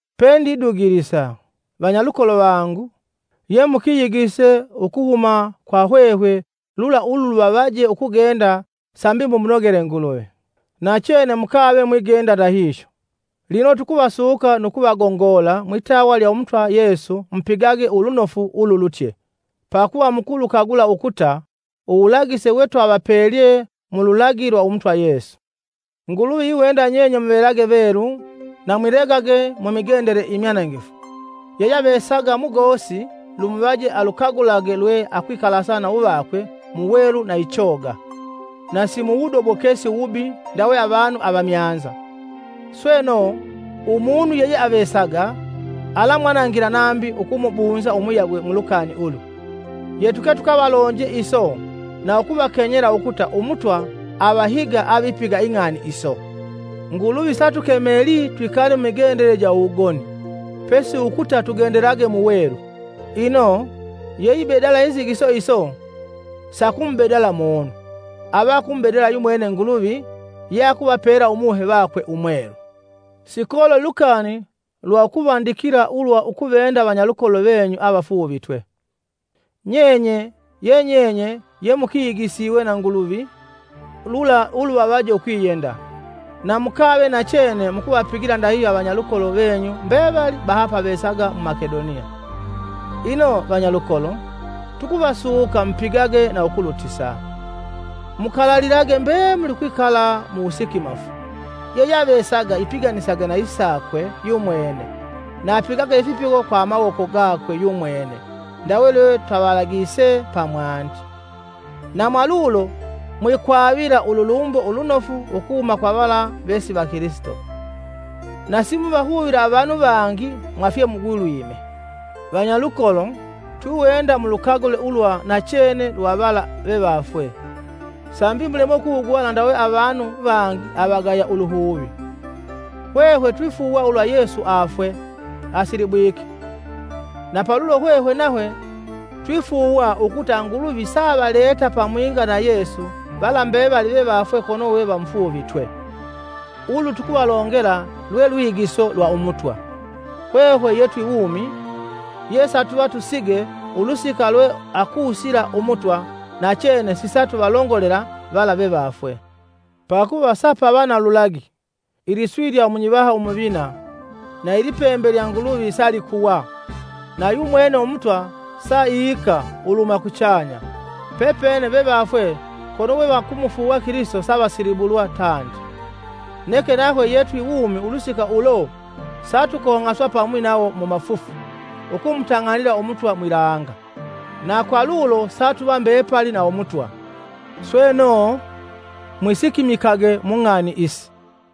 Pendidugilisa, vanyalukolo vangu, ye mukiyigise ukuhuma kwa hwehwe lula uluvavaje ukugenda sambi mumunogele Nguluvi. Nachene mukave mwigenda ndahihyo. Lino tukuvasuka nu kuvagongola mwitawa lya Umutwa Yesu mupigage ulunofu ululutye. Pakuva mukulukagula ukuta uwulagise we twavapelye mu mululagi lwa Umutwa Yesu. Nguluvi iwenda nyenye muvelage velu na mwilegage mu migendele imyanangifu. Yeyeavesaga mugosi lumuvaje alukagulage lwe akwikalasa na uvakwe mu welu na ichoga, na si muwudobokesi uwubi ndawe avanu avamyanza. Sweno, umunu yeyeavesaga alamwanangila nambi ukumubunza umuyagwe mu lukani ulu. Yetuke tukavalonje iso na ukuvakenyela ukuta Umutwa avahiga avipiga ing'ani iso. Nguluvi satukemelii twikale mumigendele ja uwugoni, pesi ukuta tugendelage mu welu. Ino, yeibedala inzigiso iso sakumubedala munu, ava akumubedala yumwene Nguluvi ye akuvapela Umuhe vakwe Umwelu. Sikololi lukani lwa ukuvandikila ulwa ukuvenda vanyalukolo venyu avafuuvitwe. Nyenye, yenyenye ye mukigisiwe na Nguluvi lula uluvavaje ukwiyenda. Na mukave nachene mukuvapigila ndahihyo avanyalukolo venyu mbevali bahapavesaga mu Makedoniya. Ino, vanyalukolo, tukuvasuka mupigage na ukulutisa. Mukalalilage mbemuli ukwikala mu wusikimafu, yeyeavesaga ipiganisage na isakwe yumwene na apigage ifipigo kwa amawoko gakwe yumwene ndawe lwe twavalagise pamwandi. Na mwalulo mwikwavila ululumbo ulunofu ukuhuma kwa vala vesi vakilisito, na simuvahuvila avanu vangi mwa fyemugulwime. Vanyalukolo, twiwenda mulukagule ulwa nachene lwa vala vevafwe, sambi mulemwe ukuhuguvala ndawe avanu vangi avagaya uluhuvi. Hwehwe twifuuwa ulwa Yesu afwe, asilibwike; na palulo hwehwe nahwe twifuuwa ukuta Nguluvi saavaleta pamwinga na Yesu vala mbevali vevafwe kono we vamufuuvitwe. Ulu tukuvalongela lwe lwigiso lwa Umutwa; hwehwe ye twi wumi, ye satuva tusige ulusika lwe akusila Umutwa, nachene sisatuvalongolela vala vevafwe. Pakuva sapava na lulagi, iliswi lya munyivaha umuvina, na ilipembe lya Nguluvi salikuwa, na yumwene Umutwa sa ika uluhuma kuchanya. Pepene vevafwe kono we vakumufuuwa Kilisito savasilibulwa tandi. Neke nahwe ye twi wumi ulusika ulo satukong'aswa pamwi nawo mu mafufu ukumutang'anila Umutwa mwilanga. Na kwa ndahihyo satuva mbepali na Umutwa. Sweno, mwisikimikage mung'ani isi.